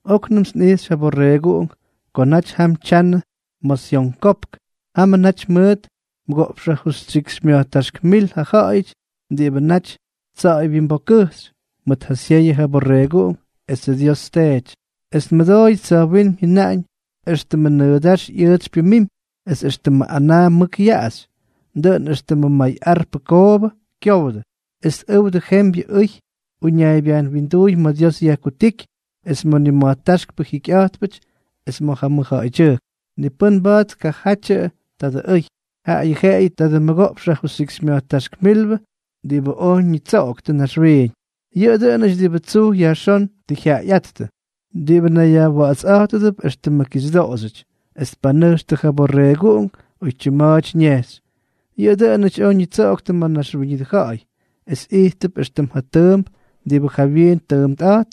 Oknʉmts nꞌijxy ja Borreeguꞌunk ko naty jam tyanʉ ma̱ Syon Kopk. Jamʉ naty mʉʉt mʉgoꞌpx jajustyikxymya̱jtáxk mil ja ja̱ꞌa̱yʉty diꞌibʉ naty tsa̱ꞌa̱y wyimbokkʉjxy mʉt ja syeyʉ ja Borreeguꞌunk esʉ Dios Teety. Es nmʉdooyʉts tsa̱jwínm jyʉnaꞌañ éxtʉmʉ nʉʉdáx ꞌyʉʉtsy pyʉmimy, es éxtʉmʉ anaa mʉk yaꞌaxy, dʉꞌʉn éxtʉmʉ may arpʉ koobʉ kyowdʉ. Es tꞌʉwdʉ jembyʉ ʉy uñaaybyajn winduuy ma̱ Dios yajkutíky es ma̱ nima̱jtáxkpʉ jikyꞌa̱jtpʉty es ma̱ ja mʉjja̱ꞌa̱ydyʉjk. Ni pʉ́n mba̱a̱t tkajatyʉ tadʉ ʉy, jaꞌayʉ jeꞌeyʉ tadʉ mʉgoꞌpx jajustyikxymya̱jtáxk mil diꞌibʉ oj ñitsoꞌoktʉ naxwiiñ. Yʉꞌʉ dʉꞌʉnʉty diꞌibʉ tsuj yajxón tʉ jyaꞌayꞌáttʉ, diꞌibʉ nayyajwa̱ꞌa̱tsꞌa̱jtʉdʉp éxtʉmʉ kixyʉdoꞌoxyʉty, es tpanʉjxtʉ ja Borreeguꞌunk oytyim ma̱a̱ty ñejxy. Yʉꞌʉ dʉꞌʉnʉty oj ñitsoꞌoktʉ ma̱ naxwíñʉdʉ ja̱ꞌa̱y es ijttʉp éxtʉm ja tʉʉmp diꞌibʉ jawyiin tʉʉmpꞌa̱jtp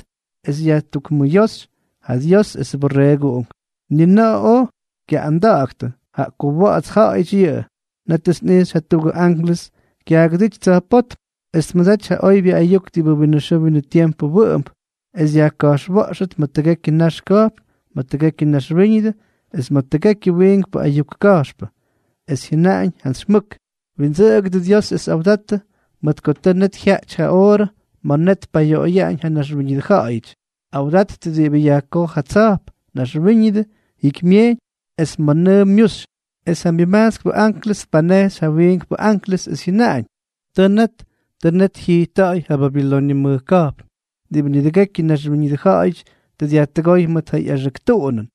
es yajtukmʉyóxy ja Dios esʉ Borreeguꞌunk. Ni na̱ꞌa̱ oj kyaꞌꞌanda̱ꞌa̱ktʉ, jaꞌa ko wa̱ꞌa̱ts ja̱ꞌa̱yʉty yʉꞌʉ. Nétʉts nꞌijxy jatuꞌugʉ anklʉs kyaagʉdíty tsa̱jpótm, es tmʉdaty ja oybyʉ ayuk diꞌibʉ winʉ xʉʉ winʉ tiempʉ wʉꞌʉmp, es yajka̱jxwa̱ꞌxʉt ma̱ tʉgekyʉ nax ka̱jpn, ma̱ tʉgekyʉ naxwíñʉdʉ, es ma̱ tʉgekyʉ wiinkpʉ ayuk ka̱jxpʉ. Es jyʉnaꞌañ jantsy mʉk: —Windsʉꞌʉgʉdʉ Dios es awdattʉ, mʉt ko tʉ net jyaꞌty ja oorʉ ma̱ net tpayoꞌoyaꞌañ ja naxwíñʉdʉ ja̱ꞌa̱yʉty. Awdattʉ diꞌibʉ yajkoj ja tsa̱jp, naxwíñʉdʉ, jikymyejyñ, es ma̱ nʉʉ myuxy. Es ja myʉmajtskpʉ anklʉs tpanejxy ja jawyiimbʉ anklʉs, es jyʉnaꞌañ: —Tʉ net, tʉ net jyijtta̱ꞌa̱y ja Babiloñʉ mʉj ka̱jpn diꞌibʉ nidʉgekyʉ naxwíñʉdʉ ja̱ꞌa̱yʉty tʉ dyajtʉgóy mʉt ja ꞌyaxʉk tuꞌunʉn,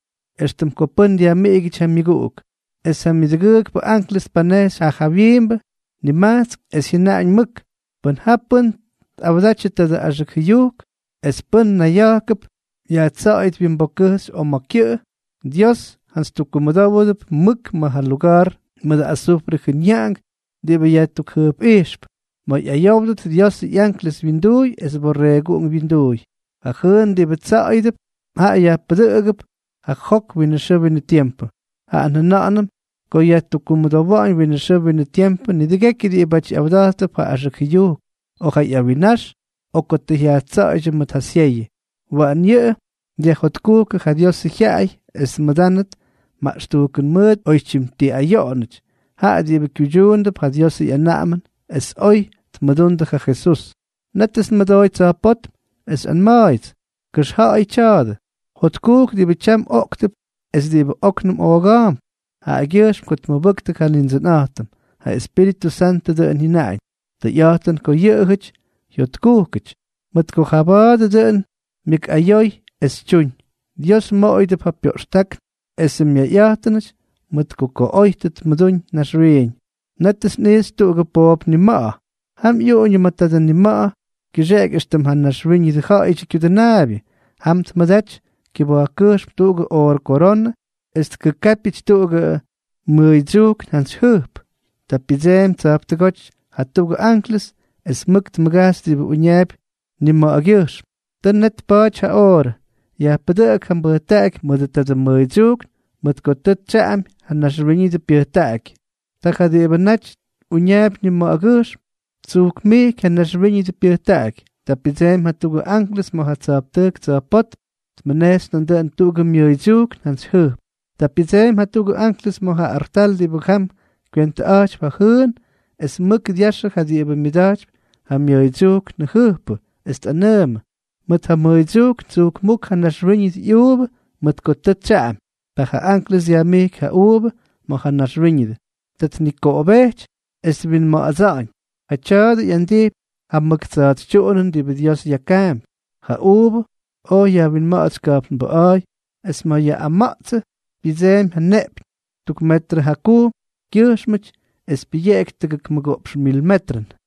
éxtʉm ko pʉ́n dyajmiꞌigyʉty ja myʉguꞌuk. Es ja myʉdʉgʉʉkpʉ anklʉs tpanejxy ja jawyiimbʉ nimajtsk, es jyʉnaꞌañ mʉk: —Pʉn ja pʉ́n tꞌawdatyʉ tadʉ axʉk jʉyujk, es pʉ́n nayya̱jkʉp yajtsa̱ꞌa̱yʉt wyimbokkʉjxy o ma̱ kyʉꞌʉ, Dios jantsy tukkumʉdówʉdʉp mʉk ma̱ ja luga̱a̱r mʉdʉ azufrʉ jʉnyaꞌank diꞌibʉ yajtukjʉjpꞌijxp, ma̱ ꞌyayówdʉt Diosʉ ꞌyanklʉs wyinduuy es Borreeguꞌunk wyinduuy. Ja jʉʉn diꞌibʉ tsa̱ꞌa̱yʉdʉp, jaꞌa yajpʉdʉꞌʉgʉp ja jok winʉ xʉʉ winʉ tiempʉ. Jaꞌa njʉna̱ꞌa̱nʉm ko yajtukkumʉdowa̱ꞌa̱ñ winʉ xʉʉ winʉ tiempʉ nidʉgekyʉ diꞌibáty ꞌyawda̱jttʉp ja axʉk jʉyujk, o ja ꞌyawinnax, o ko tʉ yajtsa̱ꞌa̱ydyʉ mʉt ja syeyʉ. Waꞌan yʉꞌʉ dyajjotkujkʉ ja Diosʉ jyaꞌay es tmʉdánʉdʉt maꞌxtujkʉn mʉʉt oytyim ti ayoꞌonʉty, jaꞌa diꞌibʉ kyuydyuundʉp ja Diosʉ ꞌyanaꞌamʉn es oy tmʉdundʉ ja Jesús. Nétʉts nmʉdooy tsa̱jpótm, es xyꞌanma̱a̱yʉts: —Kʉxja̱ꞌa̱yʉ tya̱a̱dʉ: “Jotkujk diꞌibʉ tyam oꞌktʉp es diꞌibʉ óknʉm ooga̱a̱mp jaꞌagyʉjxm ko tmʉbʉktʉ ja Nindsʉnꞌa̱jtʉm.” Ja Espíritʉ Santʉ dʉꞌʉn jyʉnaꞌañ: “Tʉyꞌa̱jtʉn ko yʉꞌʉjʉty jyotkujkʉty, mʉt ko jaba̱a̱dʉ dʉꞌʉn myʉkꞌayoy es tyuñ. Dios moꞌoyʉdʉp ja pyoꞌxtákn es myayꞌata̱ꞌa̱ñʉty mʉt ko oy tʉ tmʉdúñ naxwiiñ.” Nétʉts nꞌijxy tuꞌugʉ poop nima̱ꞌa̱. Jam ꞌyuꞌuñʉ ma̱ tadʉ nima̱ꞌa̱ kyʉxeꞌeky éxtʉm ja Naxwíñʉdʉ Ja̱ꞌa̱yʉdyʉ Kyudʉnaabyʉ. Jam tmʉdaty kyʉba̱jkkʉjxm tuꞌugʉ oorʉ koronʉ, es tkʉkápyʉty tuꞌugʉ mʉʉydsyujkn jantsy jʉjp. Ta pyʉdseemy tsa̱jptʉgóty jatuꞌugʉ anklʉs, es mʉk tmʉgajxy diꞌibʉ uñaapy nima̱ꞌa̱gʉjxm: —Tʉ net tpa̱a̱ty ja oorʉ. Yajpʉdʉꞌʉk ja mbʉjtaꞌaky mʉdʉ tadʉ mmʉʉydsyujkn, mʉt ko tʉ tsyaꞌamy ja naxwíñʉdʉ pyʉjtaꞌaky. Ta ja diꞌibʉ naty uñaapy nima̱ꞌa̱gʉjxm, ttsujkmijky ja naxwíñʉdʉ pyʉjtaꞌaky. Ta pyʉdseemy jatuꞌugʉ anklʉs ma̱ ja tsa̱jptʉjk tsa̱jpótm, tmʉnejxy nandʉꞌʉn tuꞌugʉ myʉʉydsyujkn jantsy jʉjp. Ta pyʉdseemy jatuꞌugʉ anklʉs ma̱ ja artal diꞌibʉ jam kywentʉꞌa̱jtypy ja jʉʉn, es mʉk dyaxʉ ja diꞌibʉ myʉda̱jtypy ja myʉʉydsyujkn jʉjppʉ, es tꞌanʉʉmʉ: —Mʉt ja mmʉʉydsyujkn tsujkmúk ja naxwíñʉdʉ ꞌyuuvʉ, mʉt ko tʉ tsyaꞌamy. Ta ja anklʉs dyajmijky ja uuvʉ ma̱ ja naxwíñʉdʉ. Ta tnikoꞌobejty es twinma̱ꞌa̱dsa̱ꞌa̱ñ. Jaꞌa tya̱a̱dʉ ꞌyandijpy ja mʉk tsa̱a̱tsytyuꞌunʉn diꞌibʉ Dios yakaampy. Ja uuvʉ oj yajwinma̱ꞌa̱tsy ka̱jpnbʉꞌa̱a̱y. Es ma̱ yaꞌꞌama̱ꞌtsʉ pyʉdseemy ja neꞌpyñ tuk metrʉ jakujm kyʉjxmʉty es pyʉyeꞌky tʉgʉk mʉgoꞌpx mil metrʉn.